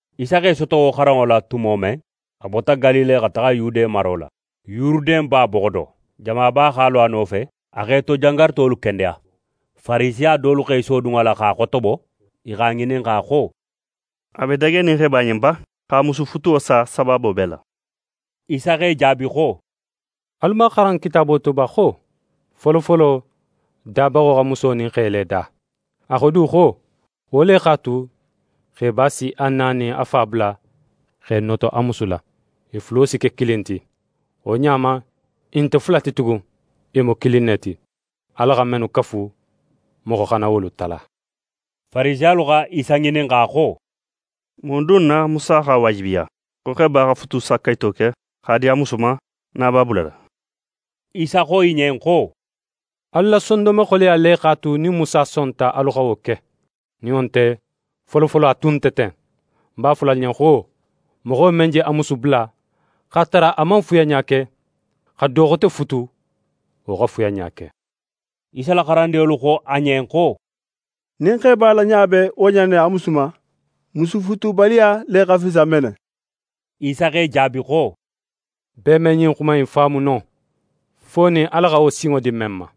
Isa x'é soto wo xaranŋo la tumo men, a bota Galile xa taxa Yude maro la, Yuruden ba boxo do. Jamaba x'a lo a nofe, a x'e to jangarutolu kendeya. Farisiya dolu x'e sodun a la x'a xotobo. I x'a ŋininxa xo: «A be dagenin xeba ɲen ba, x'a musu futuwo sa sabaabo bee la?» Isa x'e jaabi xo: «Alu man a xaran Kitaabo to ba, xo: “Folofolo, Dabaxo xa muso nin xe le da?” A xo du xo: “Wo le x'a tu, xeba si a na nin a fa bula x'é noto a musu la. I fulo si ke kilin ti.” Wo ɲa ma, i nte fula ti tugun, i mu kilin ne ti. Ala xa mennu kafu, moxo xana wolu tala.» Farisiyalu xa Isa ŋininxa xo: «Mun dun na Musa x'a waajibiya xo xeba xa futusakayito ke x'a di a musu ma, nin a b'a bulala?» Isa xo i ɲen xo: «Alu la sondonme xoleya le x'a tu nin Musa sonta alu xa wo ke. Nin wo nte, folofolo, a tun nte ten. Ń b'a fola alu ɲen xo: Moxo men je a musu bula, x'a tara a man fuyanɲa ke, xa do xote futu, wo xa fuyanɲa ke.» Isa la xarandinŋolu xo a ɲen xo: «Nin xeba la ɲa be wo ɲa in ne a musu ma, musufutubaliya le xa fisa mene.» Isa x'e jaabi xo: «Bee me ɲin xuma in faamu no, fo nin Ala xa wo sinŋo di men ma.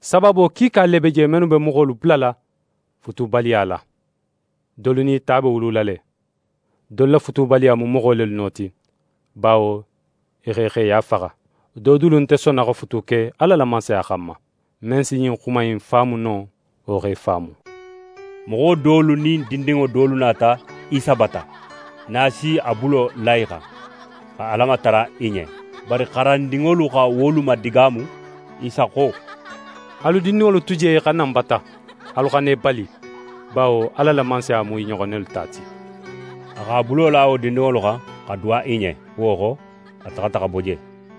Sabaabo kiika le be je mennu be moxolu bulala futubaliya la: Dolu nin i ta be wulula la; dolu la futubaliya mu moxo lelu no ti, bawo i x'e xeya faxa; do dulu nte sonna xa futu ke Ala la Mansaya xanma. Men si ɲin xuma innu faamu no, wo x'e faamu!» Moxo dolu nin dindinŋo dolu nata Isa bata nin a si a bulo la i xan, xa Ala matara i ɲen. Bari xarandinŋolu xa wolu madigaamu. Isa xo: «Alu dindinŋolu tu je i xa na ń bata, alu xana i bali, bawo Ala la Mansaya mu i ɲoxon nelu ta ti.» A x'a bulo la wo dindinŋolu xan, xa duwa i ɲen. Wo xo, a taxata xa bo je.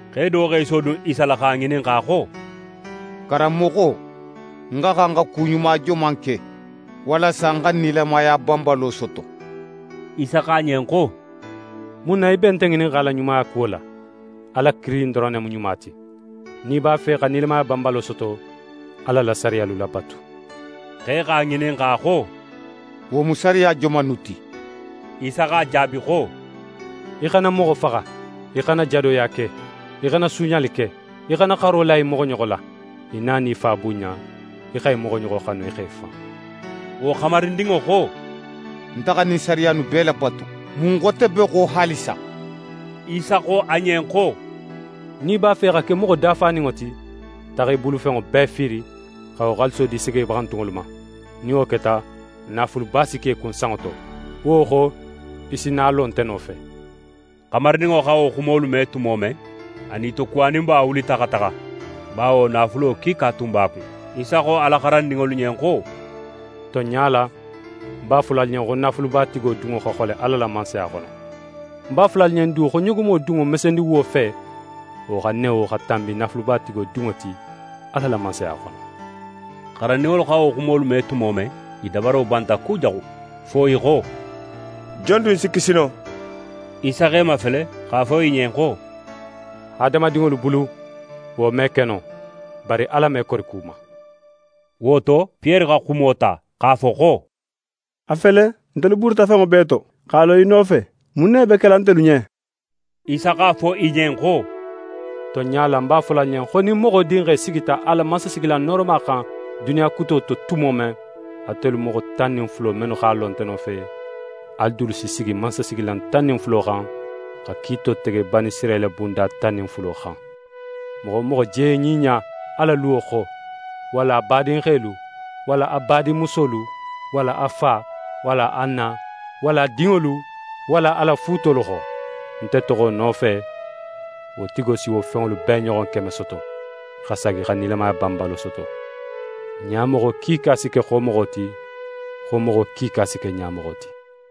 Xe do x'é sodun Isa la x'a ŋininxa xo: «Karanmoxo, ń xa xan xa ku ɲuma joman ke walasa ń xa nilamaya banbalo soto?» Isa xo a ɲen xo: «Mun na í be nte ŋininxala ɲumaya kuwo la? Ala kilin doron ne mu ɲuma ti. Nin í b'a fe xa nilamaya banbalo soto, Ala la sariyalu labatu.» Xe x'a ŋininxa xo: «Wo mu sariya joman innu ti?» Isa x'a jaabi xo: «Í xana moxo faxa, í xana jadoya ke, í xana suuɲali ke, í xana xaro la í moxoɲoxo la. Í na nin í fa bunɲa, í xa í moxoɲoxo xanu í xo í fan.» Wo xamarindinŋo xo: «Nte xa ɲin sariya innu bee labatu, mun xote be xo haalisa?» Isa xo a ɲen xo: «Nin í b'a fe xa ke moxo dafaninŋo ti, taxa í bulufenŋo bee fiiri, xa wo xaaliso di segebaxantunŋolu ma. Nin wo keta, naafuluba si ke í kun sanŋo to. Wo xo, í si na a lo nte nofe.» Xamarindinŋo xa wo xumolu me tumo men, a nitokuwaninba wulita xa taxa, bawo naafulo kiika tun b'a kun. Isa xo a la xarandinŋolu ɲen xo: «Tonɲa la, ń b'a fola alu ɲen xo naafulubatigo dunŋo xa xole Ala la Mansaya xono. Ń b'a fola alu ɲen du xo ɲogomo dunŋo mesendiwuwo fe, wo xa newo xa tanbi naafulubatigo dunŋo ti Ala la Mansaya xono.» Xarandinŋolu xa wo xumolu me tumo men, i dabaro banta kujaxu fo i xo: «Jon dun si kisi no?» Isa x'e mafele x'a fo i ɲen xo: «Hadamadinŋolu bulu, wo me ke no, bari Ala me kori ku ma.» Wo to, Piyere xa xumo ta x'a fo xo: «A fele, ntelu buruta fenŋo bee to, x'a lo í nofe. Mun ne be kela ntelu ɲen?» Isa x'a fo i ɲen xo: «Tonɲa la, ń b'a fola alu ɲen xo nin Moxo Dinxe sigita a la mansasigilan nooroma xan duniya kuto to tumo men, atelu moxo tan nin fulo mennu x'a lo nte nofe, alu dulu si sigi mansasigilan tan nin fula xan, xa kiito tege Banisirayila bunda tan nin fulo xan. Moxo wo moxo je ɲiɲa a la luwo xo, walla a badinxelu, walla a badinmusolu, walla a fa, walla a na, walla a dinŋolu, walla a la fuutolu xo, nte toxo nofe, wo tigo si wo fenŋolu bee ɲoxon keme soto, xa saagi xa nilamaya banbalo soto. Ɲamoxo kiika si ke xomoxo ti, xomoxo kiika si ke ɲamoxo ti.»